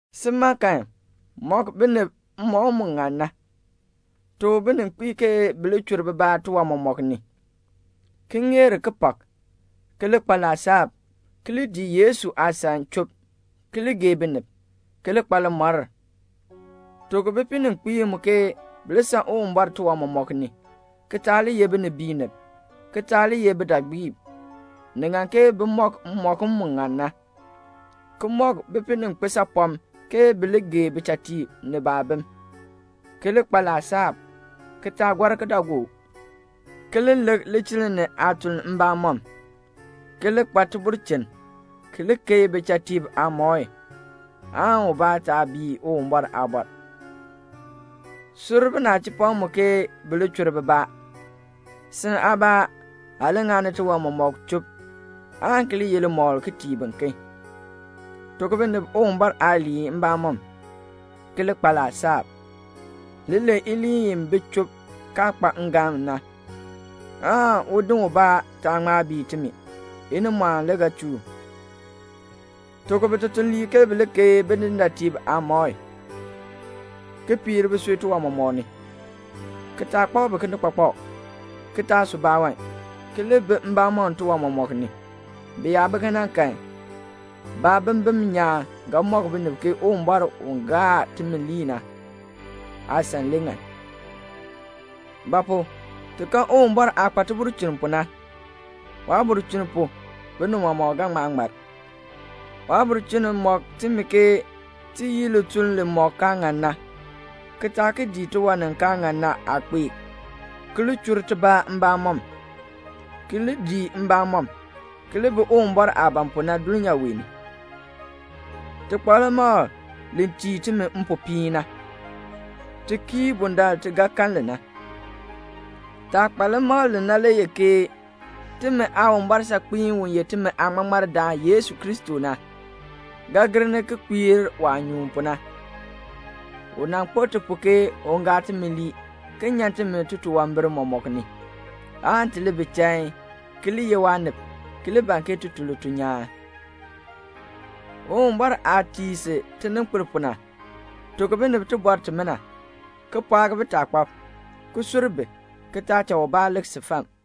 Sin, mɔk binib mmɔkm mu ŋan na. Tuk bininkpiib ke bi li chur bibaa tiwan mɔmɔk ni, ki ŋeer kipak, ki li kpa laasab, ki li dii Yesu aasan chub, ki li gee binib, ki li kpa limɔr. Tuk bipininkpiib mu ke bi li san Uwumbɔr tiwan mɔmɔk ni, ki taa li ye binibiinib, ki taa li ye bidaagbiib. Ni ŋan ke bi mɔk mmɔkm mu ŋan na, ki mɔk bipininkpiisaapɔm ke bi li gee bichatiib ni baabim, ki li kpa laasab, ki taa gɔr kidaagook, ki li lik lichiln ni aatuln mbamɔm, ki li kpa tibulchin, ki li keei bichatiib aamɔi, aan ubaa taa bii Uwumbɔr aabɔr. Sur binachipɔm mu ke bi li chur bibaa. Si aabaa, aa li ŋani tiwan mɔmɔk chub, aan ki li ye limɔkl ki tii biken. Tuk binib Uwumbɔr aaliin mbamɔm, ki li kpa laasab. Li len iliin i bi chub kaa kpa ngalm na, aan udin ubaa taa ŋma bii timi; inimɔɔn le ga chuu u. Tuk bitutuliib ke bi li keei bidindaatiib aamɔi, ki piir bisui tiwan mɔmɔk ni, ki taa kpak bi kinikpakpak, ki taa su baawan, ki li bi mbamɔm tiwan mɔmɔk ni. Bi yaa bi kena kan, baabimbin nyaan ga mɔk binib ke Uwumbɔr u ye timi Aaŋmaŋmardaan na aasan le ŋan. Ba pu? ti kan Uwumbɔr aah kpa tibulchin pu na. Waabulchin pu binib mɔmɔk ga ŋma ŋmar. Waabulchin mɔk timi ke ti yii lituln limɔk kaa ŋan na, ki taa ki dii tiwan ni kaa ŋan na aakpeek, ki li chur tibaa mbamɔm, ki li dii mbamɔm, ki li bi Uwumbɔr aah ban pu na dulnyaa wee ni. Ti kpa limakl li tii timi mpopiin na. Ti kii bundaln ti ga kan li na. Taah kpa limakl li na le ye ke timi Aawumbɔr saakpiin, u ye timi Aaŋmaŋmardaan Yesu Kristo na, ga gir ni ki kpiir waah nyuun pu na. U nan kpo ti pu ke un gaa timi lii ki nyan timi titunwambir mɔmɔk ni, aan ti li bi chain, ki li ye waanib, ki li ban ke ti tun lituln nyaan. Uwumbɔr aah tii si tininkpil pu na, tuk binib tibɔr timina, ki pɔɔk bitaakpab, ki sur bi, ki taa cha ubaa lik si fam.